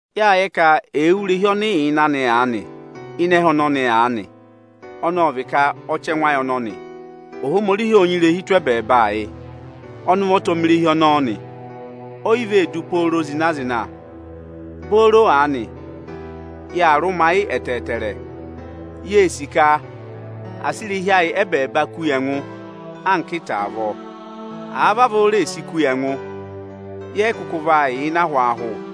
Yâ yẹ ka èe wú irehi ọnị ị yà ịnị anị ịnị ẹhẹ ọnọnị aanị, (ọnị ọ vị ka ọchẹngụ ayị ọnọnị) Ohomorihi ộ nyị irehi tụ́ ẹbẹẹba yị. Ọnị ụvọta ọ mẹ irehi ọnọọ nị. O yi vee du pooro zịna-zịna. Booro aanị, yaa rụmayị ẹtẹẹrẹ, yee sì ka à sị irehi ayị ẹbẹẹba ku yi ẹngụ anka ịta avọọ. Àa vavọọ reè si ku yi ẹngụ, yẹ yị kụkụ vaa yà ịnị ahwaahụ.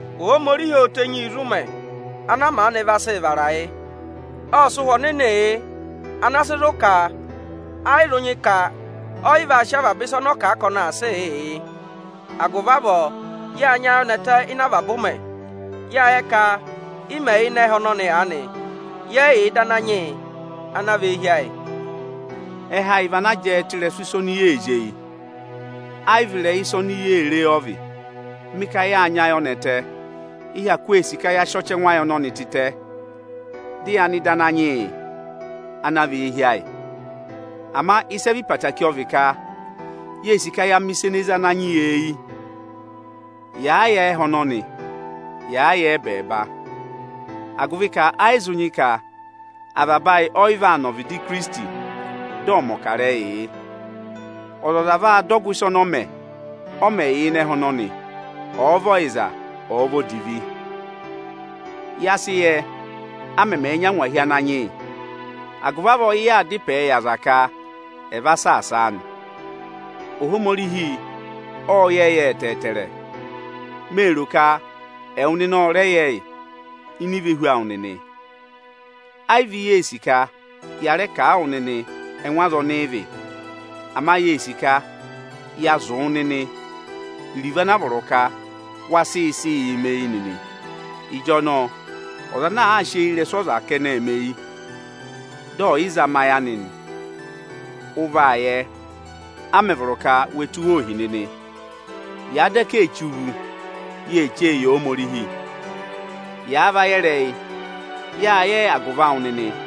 Ohomorihi ô tenyi yi zi ụmẹ ana a maanị vaa sị vara yị. Ộ sị Ụhwẹ Ohomorihii yị ana sị zụ̀ ka ẹ yị zụ nyị ka ọ yị vaa sị avaba ịsa ọnị ọ ka ọnị vaa sịị yịị yị. Agụvị avọọ, yá nyị ayọnẹtẹ ịnị avaba ụmẹ. Yâ yẹ ka ị mẹ̀ yà ịnị ẹhẹ ọnọnị aanị, yẹ yị yà ịdị Ananyị yị ana vị eehi ayị. Ẹhẹ ayị vị ana jẹẹ tụ́ ịrẹsụ ịsa oni yee zí eyi, ẹ yị vị ịrẹyị ịsa oni yee re ọ vị. Mị ka yâ nyị ayọnẹtẹ, ị hyakụ ee sì ka ya sị ọchẹngụ ayị ọnọnị tịtẹ, dị ya nọ ịdị Ananyị yị ana vị eehi ayị. Ịsa ene hu keekere ọ vị ka, yee sì ka yaa mẹ̀ ịsa ene zé Ananyị yị eyi, yàa yà ẹhẹ ọnọnị, yàa yà ẹbẹẹba; agụvị ka ẹ yị zụ nyị ka avaba ayị ọ yị vaa nọ ọvịdị Ikirisiti, dị ọ̀ mẹ̀ ọkarẹyị yị. Ọzọza vaa dọ ọgụ ịsa ọnị ọ mẹ, ọ mẹ̀ yà ịnị ẹhẹ ọnọnị; ọ̀ọ vị ọyịza, ọ̀ọ vị odivi. Ya sị yẹ, a mẹmẹẹ̄ nyị angwahi Ananyị yị. Agụvị avọọ ị yaa da ịpẹẹ yị aza ka ẹ̀ va saasa a nị. Ohomorihi ộ yẹ yị ẹtẹẹtẹrẹ. Mee ro ka ẹwụ nịnị ọ rẹ yẹ yị ini ivehu awụ nịnị. Ẹ yị vị yee sì ka ya rẹẹ kà a wụ nịnị ẹngụ aza ọnị ị vị. Ama yee sì ka ya sị zụ̀ wụ nịnị iruvo ana vọrọ ka wa sị sịị yị mẹ eyi nịnị. Ịjọnọọ ọza ana àa sị eyirẹsụ ọza kẹnẹẹ mẹ eyi, dị ẹ̀ yị zama ayị anị nị, ụ vaa yẹ, a mẹ̀ vọrọ ka we tụ́ wa ohi nịnị. Yàa daka ee che uvu, yee che e yi Ohomorihi. Yàa va yẹ ịrẹyị, yâ yẹ ẹ agụvị awụ nịnị.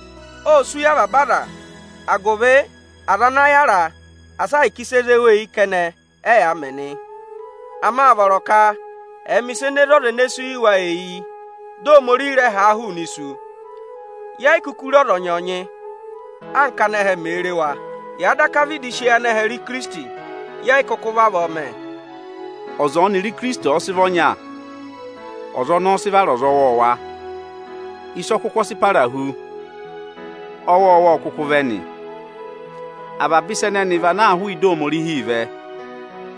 Ô sú yị avaba aza agụvị aza ana yára asị ahịka ịsị e zé wa eyi kẹnẹ, ẹyaa mẹ nị. Ama â vọrọ ka ẹ̀ẹ mẹ ịsị e zé ọza ene sú yị wa eyi, dị Ohomorihi rẹ ha a hụụnị isu. Ye yi kuku re ọzọnyị-ọzọnyị, anka ánẹhẹ mee re wa. Yàa daka vịdị sị eyi anẹhẹ re Ikirisiti, yẹ yị kụkụ vavọọ mẹ. Ọza ọnịrị Ikirisiti ọ̀ọ sị vị ọnya, ọza ọnọọ ọ sị vara ọza ọwọọwa. Ịsa ọkụkụ ọ sị para hu, ọwọọwa ọ kụkụ vẹ nị. Avaba ịsa ẹnẹnị vị ana hụụ ịdị Ohomorihi vẹ.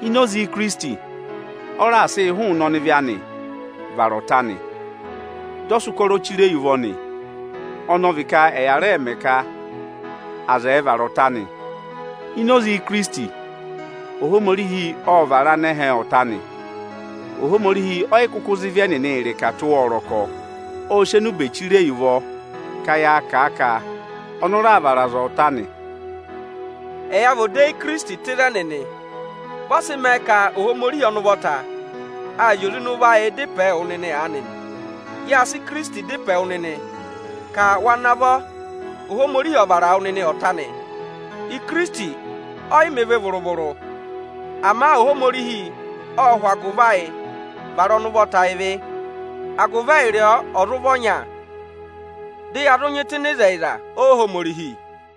Ini oze Ikirisiti ọ raà sị yị hụụnị ọnịvị anị va vara ọta anị. Dị ọ sị ụkọrọ chire yi ụvọ nị, ọnị ọ vị ka ẹ̀ yà rẹẹ mẹ ka aza ẹ̀ vara ọta anị. Ini oze Ikirisiti, Ohomorihi ọ raà vara anẹhẹ ọta anị. Ohomorihi ọ yị kụkụ za ịvị ẹnịnị tụ́ wa ọrọkọ. Ô si enube chire yi ụvọ ka yaa kà a ka ọnị ọ raà vara aza ọta anị. Ẹya vị odeyi Ikirisiti tụ́ ịzẹnị nị. Vị ọ sị mẹẹ ka Ohomorihi ụvọta aa zị oze ịnị ụvọ ayịị dá ịpẹẹ wụ nịnị aanị nị: “Yâ sị Ikirisiti dá ịpẹẹ wụ nịnị ka wa navọ Ohomorihi ọ̀ vara wụ nịnị ọta anị.” Ikirisiti ọ yị mẹ ịvị vụrụ-vụrụ. Ama Ohomorihi ọ́ hụ agụvị ayị vara ọnị ụvọta ịvị, agụvị ẹyịrị ọọ ọ̀ zụ vị ọnya, dị ya zụ nyị tụ́ ịnị ịzẹyịza Ohomorihi.